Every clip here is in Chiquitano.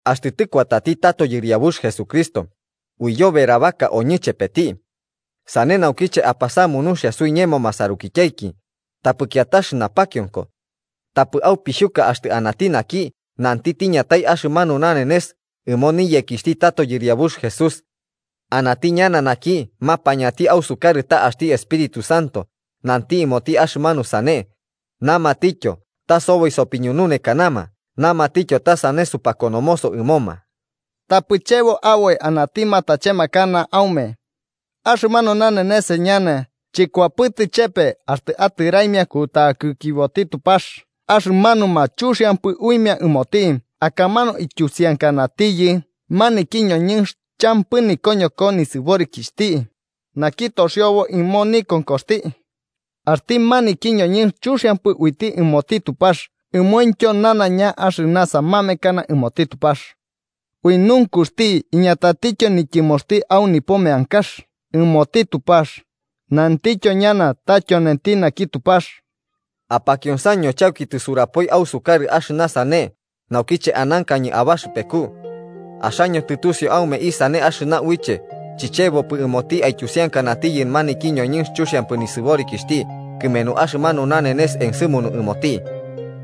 Axtɨ tɨkuatati tato yɨriabux Jesucristo, uiyoberabaka oñɨ chepeti. Sane naukiche, apasamu nuxia suiñemo masarukityaiki, tapɨ kiatax napakionko. Tapɨ aupixhuka axtɨ anati naki nanti tiñatai axɨmanu nanenes ɨmo niyekixhti tato Yɨriabux Jesús. Anati ñana naki mapañati ausukarɨ ta axti Espíritu Santo nanti ɨmoti axɨmanu sane, namatityo ta soboi sopiñununekanama namatityo ta sane supakonomoso ɨmoma. Tapɨ chebo aboi anati matachemakana aume. Axɨmanu nanenes ñana chɨkuapɨtɨ chepe axtɨ atɨraimia kutakikiboti Tupax axɨmanuma chuxiampɨ uimia ɨmoti akamanu ityusiankanatiyɨ maniki ñoñɨnx champɨ nikoñoko nisɨborikixhti, naki toxiobo ɨmo nikonkoxti. Axti maniki ñoñɨnx chuxiampɨ uiti ɨmoti Tupax ɨmointyo nanaiña axɨna samamekana ɨmoti Tupax. Ui nunkuxti, iñatatityo nityɨmoxti au nipo meankax ɨmoti Tupax, nantityo ñana ta tyonenti naki Tupax. Apakionsaño chauki tisurapoi ausukarɨ axɨna sane naukiche anankañɨ abaxɨpeku. Axaño tɨtusiu aume isane axɨna uiche chichebopɨ ɨmoti aityusiankanatiyɨ maniki ñoñɨnx chuxiampɨ nisɨborikixhti kɨmenu axɨmanu nanenes ensɨmunu ɨmoti.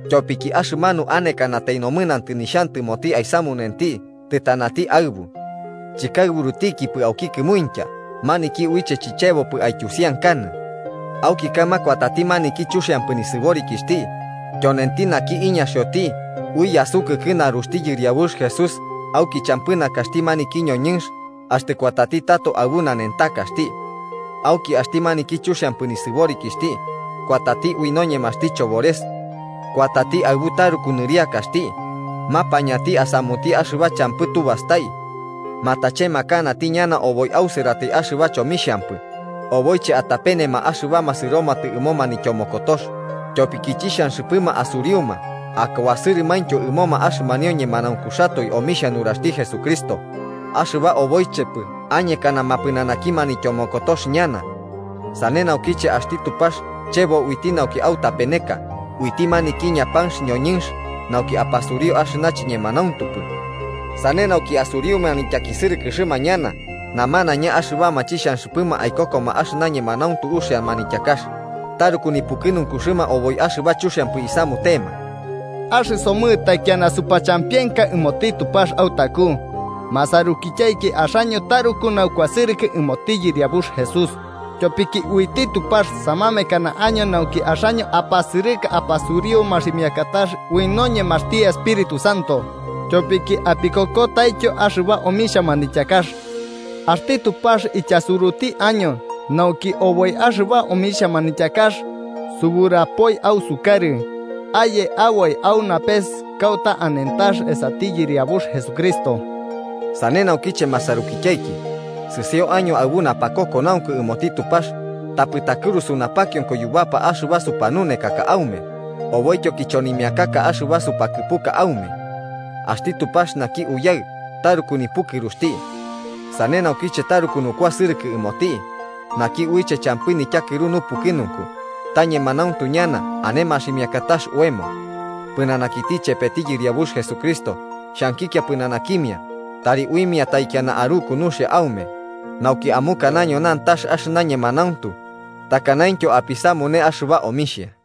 Tyopiki axɨmanu anekanatai nomɨnantɨ nixhantɨmoti aisamunenti tɨtanati aɨbu. Chɨkaɨburutikipɨ auki kɨmuintya maniki uiche chichebopɨ aityusiankanɨ. Auki kaɨma kuatati maniki chuxiampɨ nisɨborikixhti, tyonenti naki iñaxioti ui yasukɨkɨ naruxti Yɨriabux Jesús auki champɨ nakaxti maniki ñoñɨnx axtɨ kuatati tato aɨbu nanentakaxti. Auki axti maniki chuxiampɨ nisɨborikixhti, kuatati ui noñemaxti chobores. Kuatati aɨbu taruku nɨriakaxti, mapañati asamuti axɨba champɨ tubastai. Matachemakanati ñana oboi ausɨratai axɨba chomixhampɨ oboiche atapenema axɨbama sɨromatɨ ɨmo manityomokotox, tyopiki chixhanxɨpɨma asuriuma akuasɨrɨtyo ɨmoma axɨmanio ñemanaunkuxatoe omixhia nuraxti Jesucristo, axɨba oboichepɨ añekanama pɨnanaki manityomokotox ñana. Sane naukiche axti Tupax chebo uiti nauki autapeneka uiti maniki ñapanx ñoñɨnx nauki apasuriu axɨna chiñemanauntupɨ. Sane nauki asuriuma nityakisɨrɨkɨxɨma ñana namanaiña axɨbama chixhanxɨpɨma aikokoma axɨna ñemanauntu uxia manityakax, taruku nipukɨnunkuxɨma oboi axɨba chomixhampɨ isamutema. Axɨsomɨ taikiana supachampienka ɨmoti Tupax autaku, masarukityaiki axaño taruku naukuasɨrɨkɨ ɨmoti Yɨriabux Jesús, tyopiki uiti Tupax samamekana año nauki axaño apasɨrɨka apasuriu maximiakatax ui noñemaxti Espíritu Santo tyopiki apikokotaityo axɨba omixhia manityakax. Axti Tupax ityasuruti año nauki oboi axɨba omixhia manityakax suburapoi ausukarɨ, aye aboi au napes kauta anentax esati Yɨriabux Jesucristo. Sane naukiche masarukityaiki, sɨsio año aɨbu napakokonaunku ɨmoti Tupax tapɨ takɨrusu napakionko yubapa axɨba supanunekaka aume oboityo kichonimiakaka axɨba supakɨpuka aume. Axti Tupax naki Uyaɨ taruku nipukɨruxti. Sane naukiche taruku nukuasɨrɨkɨ ɨmoti, naki uiche champɨ nityakɨru nupukɨnunku ta ñemanauntu ñana ane maximiakatax oemo. Pɨnanakiti chepeti Yɨriabux Jesucristo xhankikia pɨnanakimia tari uimia taikiana aruku nuxia aume nauki amukanaño nantax axɨna ñemanauntu takanaintyo apisamune axɨba omixhia.